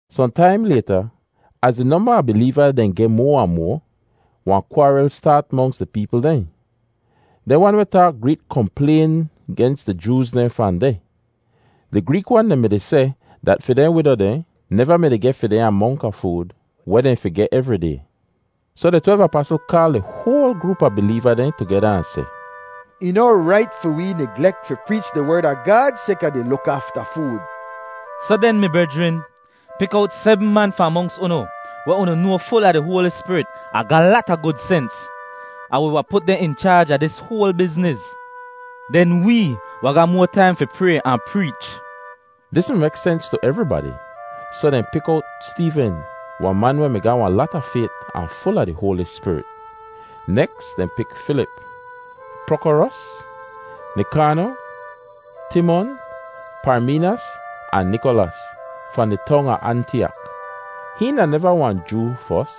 Sohn taim layta, az di nomba a bileeva dehn geh moa ahn moa, wahn kwaaril staat monks di peepl dehn. Dehn wan weh taak Greek komplayn gens di Jooz dehn fahn deh. Di Greek wan dehn mi-di seh dat fi dehn wido dehn neva mi-di geh fi dehn amonk a food weh dehn fi geh evri day. Soh di twelv apasl kaal di hoal groop a bileeva dehn tugeda ahn seh, “Ih noh rait fi wee niglek fi preech di Werd a Gaad sayka di luk afta food. Soh den, mi brejrin, pik owt sebm man fahn monks unu weh unu noa ful a di Hoali Spirit ahn ga lata gud sens, ahn wi wahn put dehn in chaaj a dis hoal bizniz. Den wee wahn ga moa taim fi pray ahn preech.” Dis mi mek sens tu evribadi, soh dehn pik owt Steeven, wahn man weh mi ga lata fayt ahn ful a di Hoali Spirit. Neks dehn pik Filip, Prokorus, Nikano, Timon, Parmeenas, ahn Nikolas, fahn di tong a Antiyak. (Hihn da neva wahn Joo fos,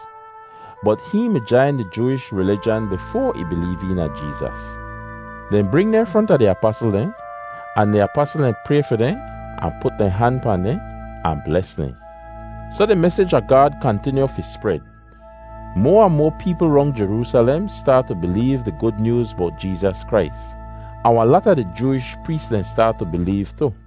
bot ih mi jain di Jooish rilijan bifoa ih bileev eena Jeezas.) Dehn bring dehn fronta di apasl dehn, ahn di apasl dehn pray fi dehn ahn put dehn han pahn dehn ahn bles dehn. Soh di mesij a Gaad kantinyu fi spred. Moa ahn moa peepl rong Jeroosalem staat tu bileev di Gud Nyooz bowt Jeezas Krais, ahn wahn lata di Jooish prees dehn staat tu bileev tu.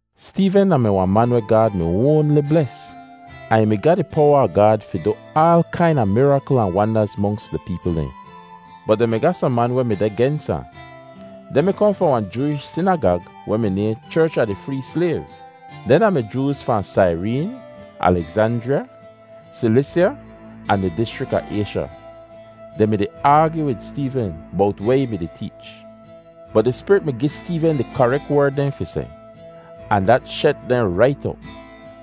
Steeven da-mi wahn man weh Gaad mi oanli bles, ahn ih mi ga di powa a Gaad fi du aal kaina mirakl ahn wandaz monks di peepl dehn. Bot dehn mi ga sohn man weh mi deh gens ahn. Dehn mi kohn fahn wahn Jooish sinagag weh mi nayhn Cherch a di Free Slayv. Dehn da-mi Jooz fahn Saireen, Alegzanjriya, Silisya, ahn di dischrik a Aysha. Dehn mi-di aagyu wid Steeven bowt weh ih mi-di teech. Bot di Spirit mi gi Steeven di karek werd dehn fi seh, ahn dat shet dehn rait op.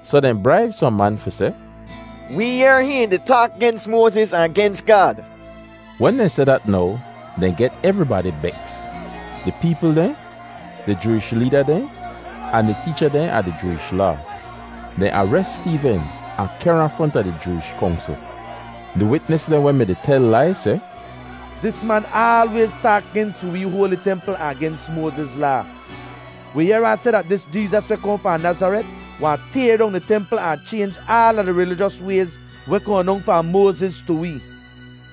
Soh dehn braib sohn man fi seh, “Wee yehr hihn di taak gens Moaziz ahn gens Gaad.” Wen dehn seh dat now, dehn get evribadi beks—di peepl dehn, di Jooish leeda dehn, ahn di teecha dehn a di Jooish Laa. Dehn ares Steeven ahn kehr ahn fronta di Jooish Kongsl. Di witnis dehn weh mi-di tel lai seh, “Dis man aalwayz taak gens fi wi hoali templ ahn gens Moaziz Laa. Wi yehr ahn seh dat dis Jeezas weh kohn fahn Nazaret wahn tayr dong di templ ahn chaynj aala di rilijos wayz weh kohn dong fahn Moaziz tu wee!”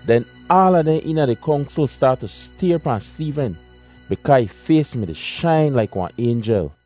Den aala dehn eena di Kongsl staat tu stayr pahn Steeven bikaa ih fays mi-di shain laik wahn aynjel.